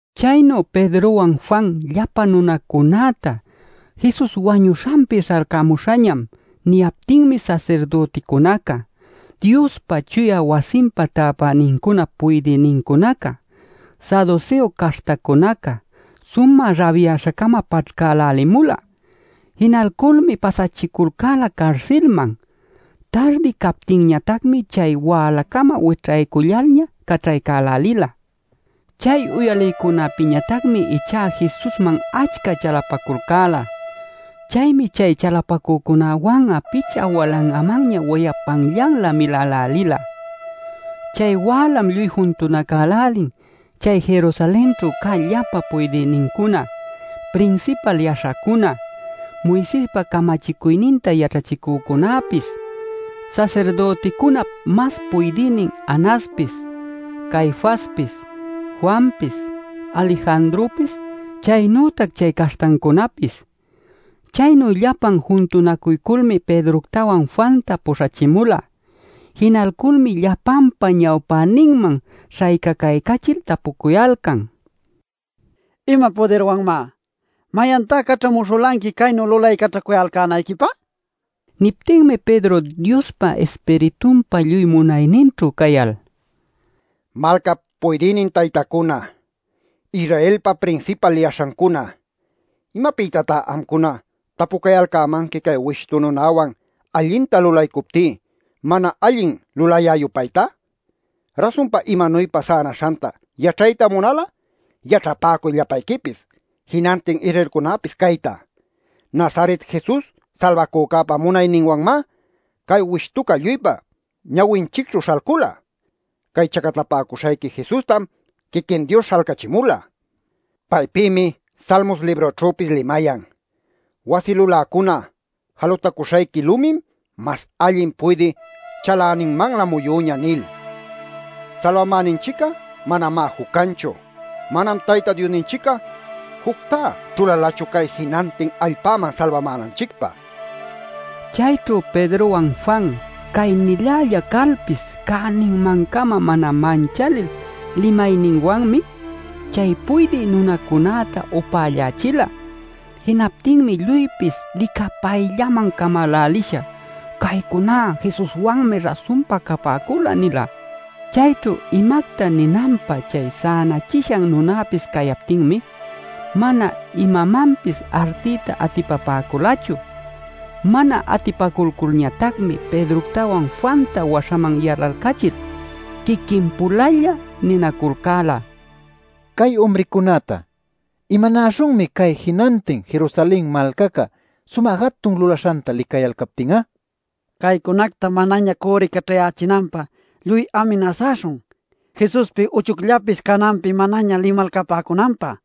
Chaynu Pedrowan Juan llapa nunacunäta “Jesus wañuśhanpi śhalcämuśhañam” niyaptinmi sasirdüticunaca, Diospa chuya wasinpa täpänincunap puydïnincunaca, saduseo caśhtacunaca sumä rabyaśha-cama paćhcälälimula. Jinalculmi pasachiculcäla carsilman. Tardi cayaptinñatacmi chay wälacama wićhaycullalña caćhaycälälila. Chay uyalïcunäpïñatacmi ichá Jesusman achca chalapaculcäla. Chaymi chay chalapacücunäwan'a picha walangamanña wayapanllanlä milälälila. Chay wälam lluy juntunacälälin chay Jerusalenćhu cä llapa puydïnincuna, prinsipal yaśhacuna, Moisespa camachicuyninta yaćhachicücunapis, sasirdüticunap mas puydïnin Anaspis, Caifaspis, Juanpis, Alejandropis, chaynütac chay caśhtancunäpis. Chaynu llapan juntunacuyculmi Pedroctawan Juanta puśhachimula. Jinalculmi llapanpa ñawpäninman śhaycacaycachil tapucuyalcan: “¿Ima pudirwanmá? ¿Mayantá caćhamuśhulanqui caynu lulaycaćhacuyalcänayquipä?” nil. Niptinmi Pedro Diospa Ispiritunpa lluy munayninćhu cayal: “Malcap puydïnin taytacuna, Israelpa prinsipal yaśhancuna: ¿Imapïtá amcuna tapucayalcämanqui cay wishtu nunawan allinta lulaycuptí mana allin lulayä-yupayta? Rasunpa imanuypa sänaśhanta yaćhayta munal'a yaćhapäcuy llapayquipis, jinantin Israelcunäpis cayta: Nazaret Jesus Salbacücäpa munayninwanmá cay wishtuca lluypa ñawinchicćhu śhalcula. Cay chacatapäcuśhayqui Jesustam quiquin Dios śhalcachimula. Paypïmi Salmos librućhüpis limayan: ‘Wasi luläcuna, jalutacuśhayqui lumim mas allin puydï chaläninmanlä muyüñä’ nil. “Salbamäninchic'a manamá juc canchu. Manam Tayta Diosninchic'a juctá ćhulalachu cay jinantin allpäman salbamänanchicpä” nila. Chayćhu Pedrowan Juan cay-nilälla calpis cäninman-cama mana manchalil limayninwanmi, chay puydï nunacunäta upällachila. Jinaptinmi lluypis licapayllaman camälälisha: “Caycuná Jesuswanmi rasunpa capäcula” nila. Chayćhu imacta ninanpä chay sänachishan nunapis cayaptinmi mana imamanpis artiyta atipapäculachu. Mana atipaculculñatacmi Pedroctawan Juanta waśhaman yalalcachil, quiquin-pulalla ninaculcäla: “Cay umricunäta ¿imanäśhunmi cay jinantin Jerusalen malcaca sumä jatun lulaśhanta licayalcaptin'a? Caycunacta manaña cürricaćhayächinanpä lluy aminasaśhun Jesuspi uchucllapis cananpi manaña limalcapäcunanpä” nil.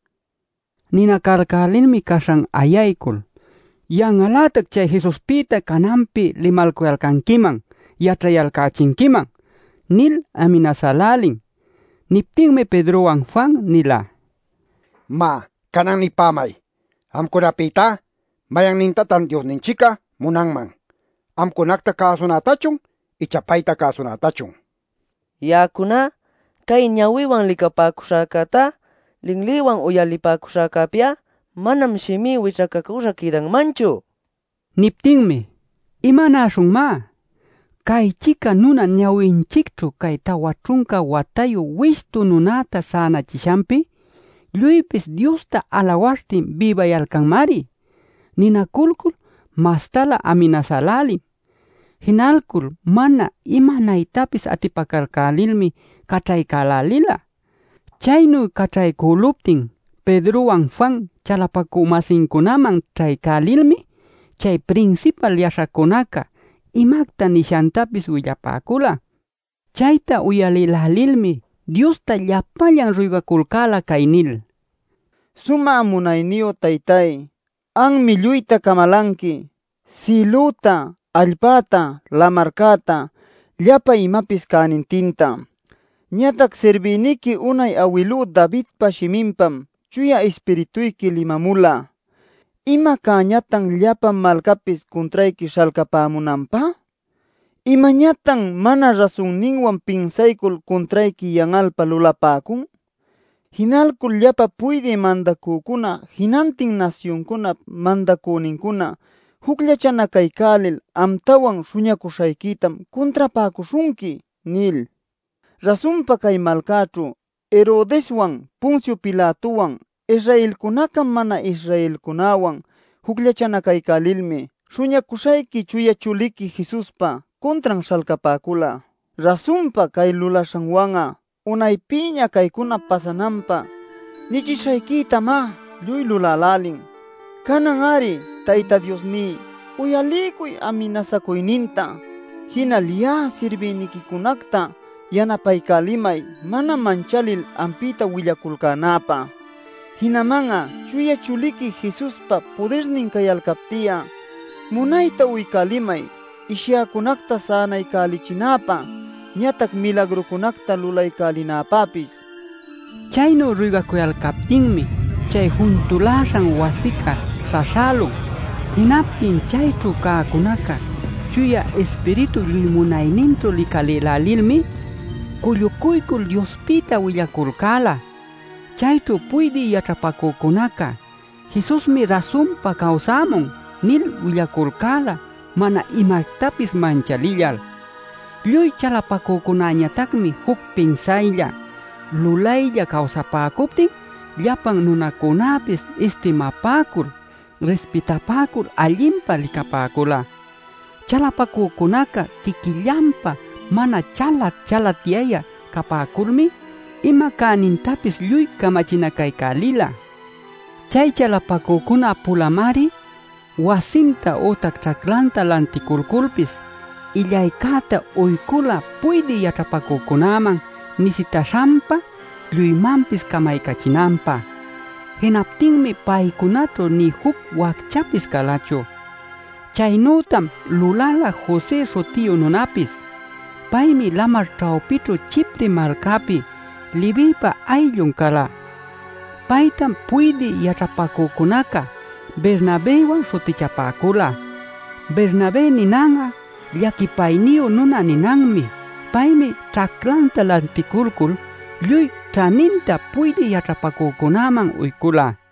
Ninacalcälilmi caśhan ayaycul: “¡Yan'al-lätac chay Jesuspïta cananpi limalcuyalcanquiman yaćhayalcächinquiman!” nil aminasälälin. Niptinmi Pedrowan Juan nila: “Má, canan nipämay. Amcunapïtá mayannintatan Diosninchic'a munanman: ¿amcunacta cäsunätachun ichá payta cäsunätachun? Ya'acuná cay ñawïwan licapäcuśhäcätá, linlïwan uyalipäcuśhäcäpi'a manam shimí wićhacacüśha quïdanmanchu” nil. Niptinmi: “¿Imanäśhunmá? Cay-chica nuna ñawinchicćhu cay tawa ćhunca watayu wishtu nunäta sänachishanpi lluypis Diosta alawaśhtin bïbayalcanmari” ninaculcul mastalä aminasälälin. Jinalcul mana imanaytapis atipacalcälilmi caćhaycälälila. Chaynu caćhaycüluptin Pedrowan Juan chalapacü-masincunaman ćhaycälilmi chay prinsipal yaśhacunaca imacta nishantapis willapäcula. Chayta uyalïlälilmi Diosta llapallan ruygaculcäla cay nil: “Sumä Munayniyu Taytay, anmi lluyta camalanqui, sïlüta allpäta lamarcäta llapa imapis cänintinta. Ñatac sirbïniqui unay awilú Davidpa shiminpam Chuya Ispirituyqui limamula: ‘¿Ima cäñatan llapa malcapis cuntrayqui śhalcapämunanpä? ¿Imañatan mana rasunninwan pinsaycul cuntrayqui yan'alpä lulapäcun? Jinalcul llapa puydï mandacücuna, jinantin nasyuncunap mandacünincuna jucllachanacaycälil amtawan Śhuñacuśhayquitam cuntrapäcuśhunqui’ nil. “Rasunpa cay malcäćhu Herodeswan Poncio Pilatowan Israelcunaca mana-Israelcunäwan jucllachanacaycälilmi Śhuñacuśhayqui Chuya Chuliqui Jesuspa cuntran śhalcapäcula. Rasunpa cay lulaśhanwan'a unaypïña caycuna pasananpä nichishayquitamá lluy lulälälin. Canan-ari Tayta Diosní, uyaliycuy aminasacuyninta. Jinal ya'a sirbïniquicunacta yanapaycälimay mana manchalil ampïta willaculcänäpä. Jinaman'a Chuya Chuliqui Jesuspa pudirnin cayalcapti'a, munayta uycälimay ishyäcunacta sänaycälichinäpä, ñatac milagrucunacta lulaycälinäpäpis” nil. Chaynu ruygaculcaptinmi chay juntuläśhan wasica śhaśhälun. Jinaptin chayćhu cäcunaca Chuya Ispiritup lluy munayninćhu licalïlälilmi cullucuycul Diospïta willaculcäla. Chayćhu puydï yaćhapacücunaca “Jesusmi rasunpa cawsamun” nil willaculcäla mana imactapis manchalillal. Lluy chalapacücunäñatacmi juc pinsaylla, lulaylla cawsapäcuptin llapa nunacunäpis istimapäcul, rispitapäcul allinpa licapäcula. Chalapacücunaca quiquillanpä mana chalat-chalatyayä capäculmi ima cänintapis lluy camachinacaycälila. Chay chalapacücuna-pulamari wasinta ütac ćhaclanta lanticulculpis illaycäta uycula puydï yaćhapacücunäman nisitäśhanpa lluymanpis camaycachinanpä. Jinaptinmi paycunaćhu nï juc wacchapis calachu. Chaynütam lulala José śhutiyu nunapis. Paymi lamar ćhawpićhu Chipre malcapi, Levïpa ayllun cala. Paytam puydï yaćhapacücunaca Bernabëwan śhutichapäcula. (Bernabé ninan'a “llaquipayniyu nuna” ninanmi.) Paymi ćhaclanta lanticulcul lluy ćhaninta puydï yaćhapacücunäman uycula.